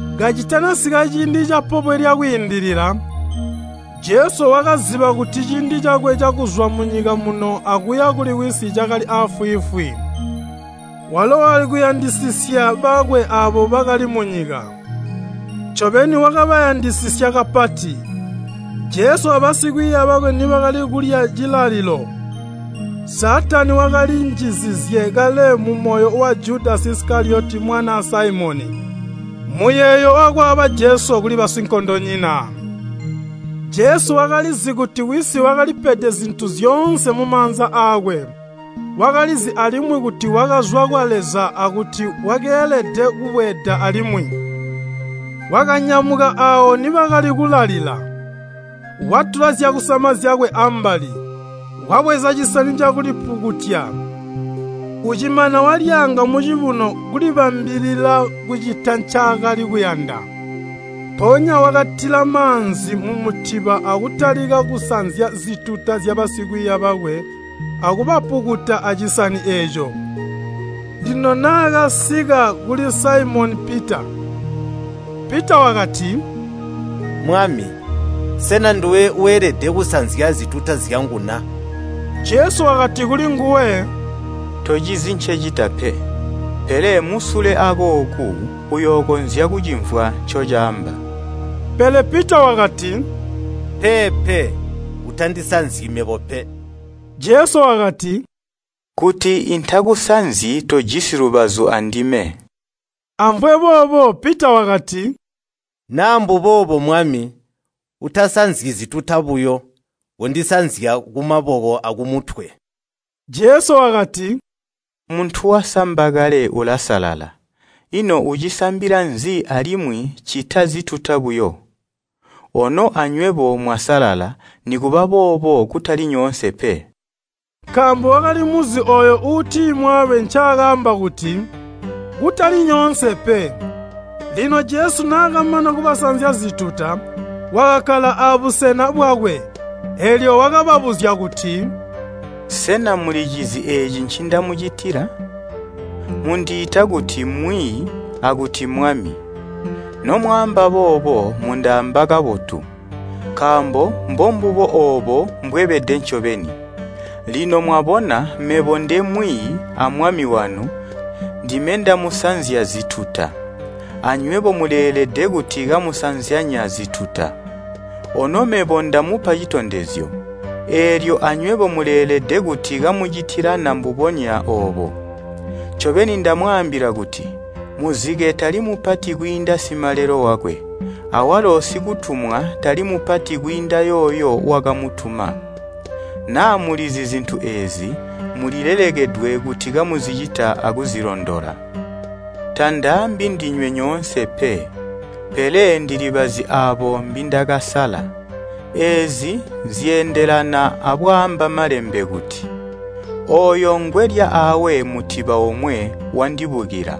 Kacitanasika ciindi ca Pobwe lya Kwiindilila, Jesu wakaziba kuti ciindi cakwe cakuzwa munyika muno akuya kuli Wisi cakali aafwiifwi. Walo wakali kuyandisisya bakwe aabo bakali munyika, ncobeni wakabayandisisya kapati. Jesu a basikwiiya bakwe nibakali kulya cilalilo, Saatani wakali njizizye kale mumoyo wa Judasi Isikaliyoti mwanaa Saimoni, muyeeyo wakwaaba Jesu kuli basinkondonyina. Jesu wakalizi kuti Wisi wakalipede zintu zyoonse mumaanza aakwe. Wakalizi alimwi kuti wakazwa kwa Leza akuti wakeelede kubweeda alimwi. Wakanyamuka aawo nibakali kulalila, watula zyakusama zyakwe ambali, wabweza cisani cakulipukutya, ucimana walyaanga mucibuno kulibambilila kucita ncaakali kuyanda. Mpoonya wakatila maanzi mumutiba akutalika kusanzya zituta zyabasikwiiya bakwe akubapukuta acisani eeco. Lino naakasika kuli Saimoni Pita, Pita wakati, “Mwami, sena nduwe weelede kusanzya zituta zyangu na?” Jesu wakati kulinguwe, “Tocizi ncecita pe, pele musule akooku uyookonzya kucimvwa ncocaamba.” Pele Pita wakati, “Peepe, utandisanzyi mebo pe!” Jesu wakati, “Kuti intakuzanzyi tojisi lubazu andime.” Amvwe boobo, Pita wakati, “Naa mbuboobo Mwami, utasanzyi zituta buyo, kondisanzya kumaboko akumutwe.” Jesu wakati, “Muntu wasamba kale ulasalala, ino ucisambila nzi alimwi ccita zituta buyo? Ono anywebo mwasalala, nikuba boobo kutali nyoonse pe.” Nkaambo wakalimuzi ooyo uutimwaabe ncaakaamba kuti, “Kutali nyoonse pe.” Lino Jesu naakamana kubasanzya zituta, wakakkala abusena bwakwe, eelyo wakababuzya kuti, “Sena mulicizi eeci ncindamucitila? Mundiita kuti, ‘Mwiiyi’ akuti ‘Mwami.’ Nomwaamba boobo mundaamba kabotu, nkaambo mbombubo oobo mbwebede ncobeni. Lino mwabona mebo nde Mwiiyi a Mwami wanu ndime ndamusanzya zituta, anywebo muleelede kuti kamusanzyanya zituta. Ono mebo ndamupa citondezyo, eelyo anywebo muleelede kuti kamucitilana mbubonya oobo. Ncobeni ndamwaambila kuti, muzike tali mupati kwiinda simalelo wakwe, awalo sikutumwa tali mupati kwiinda yooyo wakamutuma. Naa mulizi zintu eezi, mulilelekedwe kuti kamuzicita akuzilondola. Tandaambi ndinywe nyoonse pe, pele ndilibazi aabo mbindakasala. Eezi zyeendelana abwaamba Malembe kuti, ‘Ooyo ngwelya aawe mutiba omwe wandibukila.’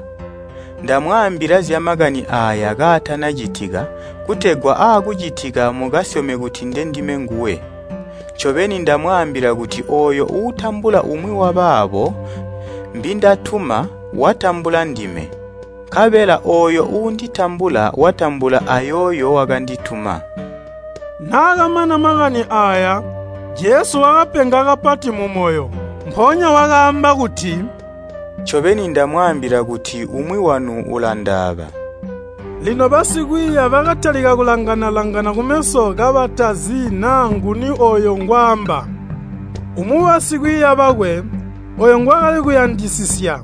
Ndamwaambila zyamakani aaya kaatanacitika kutegwa aakucitika mukasyome kuti ndendime nguwe. Ncobeni ndamwaambila kuti ooyo uutambula umwi wabaabo mbindatuma watambula ndime, nkabela ooyo uunditambula watambula ayooyo wakandituma.” Naakamana makani aaya, Jesu wakapenga kapati mumoyo, mpoonya wakaamba kuti, “Ncobeni ndamwaambila kuti umwi wanu ulandaaba.” Lino basikwiiya bakatalika kulangana-langana kumeso kabatazi naa nguni ooyo ngwaamba. Umwi wabasikwiiya bakwe, ooyo ngwaakali kuyandisisya,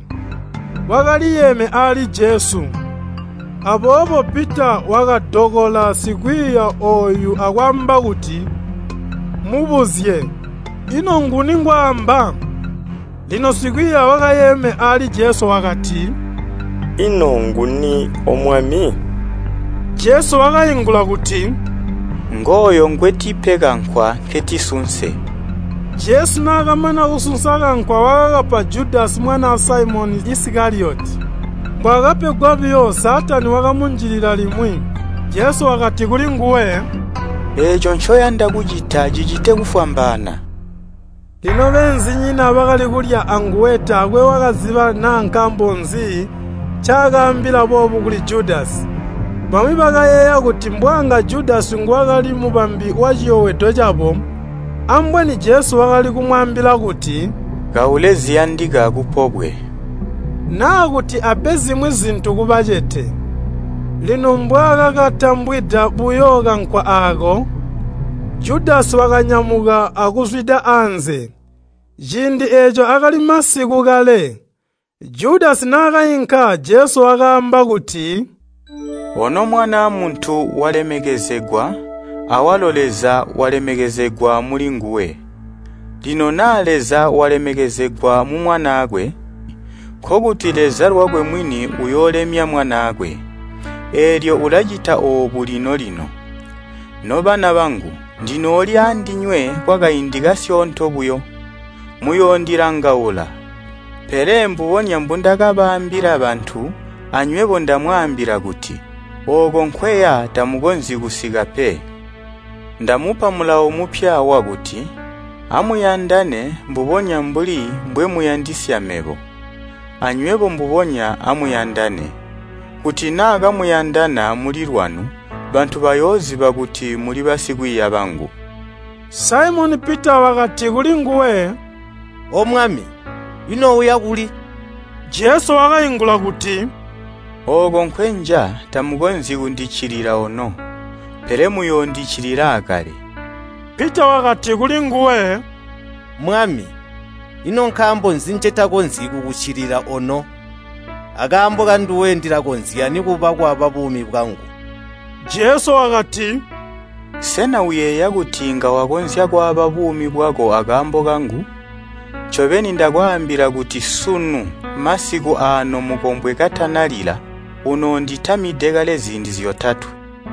wakaliyeeme aali. Aboobo Pita wakadokola sikwiiya ooyu akwaamba kuti, “Mubuzye, ino nguni ngwaamba?” Lino sikwiiya wakayeeme aali Jesu wakati, “Ino nguni, O Mwami?” Jesu wakaingula kuti, “Ngooyo ngwetipe kankwa nketisunse.” Jesu naakamana kusunsa kankwa wakakapa Judasi mwanaa Saimoni Isikaliyoti. Mbwaakapegwa buyo Saatani wakamunjilila limwi. Jesu wakati kulinguwe, “Eeco ncoyanda kucita cicite kufwambaana.” Lino beenzinyina bakali kulya anguwe taakwe wakaziba naa nkaambo nzi ncaakaambila boobu kuli Judasi. Bamwi bakayeeya kuti mbwanga Judasi nguwakali mubambi waciyobwedo cabo, ambweni Jesu wakali kumwaambila kuti, “Kaule ziyandika kupobwe,” naa kuti ape zimwi zintu kubacete. Lino mbwaakakatambwida buyo kankwa aako, Judasi wakanyamuka akuzwida anze. Ciindi eeco akali masiku kale. Judasi naakainka, Jesu wakaamba kuti, “Ono Mwanaa Muntu walemekezegwa, awalo Leza walemekezegwa mulinguwe. Lino naa Leza walemekezegwa mu Mwanaakwe, nkokuti Leza lwakwe mwini uyoolemya Mwanaakwe. Eelyo ulacita oobu lino-lino. Nobana bangu, ndinooli aandinywe kwakaindi kasyoonto buyo. Muyoondiyandaula, pele mbubonya mbundakabaambila bantu, anywebo ndamwaambila kuti, ‘Ooko nkweya tamukonzyi kusika pe.’ Ndamupa mulawo mupya wakuti, ‘Amuyandane mbubonya mbuli mbwemuyandisya mebo, anywebo mbubonya amuyandane. Kuti naa kamuyandana mulilwanu, bantu bayooziba kuti muli basikwiiya bangu.’” Saimoni Pita wakati kulinguwe, “O Mwami, ino uya kuli?” Jesu wakaingula kuti, “Ooko nkwenja tamukonzyi kundiccilila ono, pele muyoondiccilila aakale.” Pita wakati kulinguwe, “Mwami, ino nkaambo nzi ncetakonzyi kukuccilila ono? Akaambo kanduwe ndilakonzya nikuba kwaaba buumi bwangu.” Jesu wakati, “Sena uyeeya kuti inga wakonzya kwaaba buumi bwako akaambo kangu? Ncobeni ndakwaambila kuti sunu masiku aano mukombwe katanalila, unoonditamide kale ziindi zyotatwe.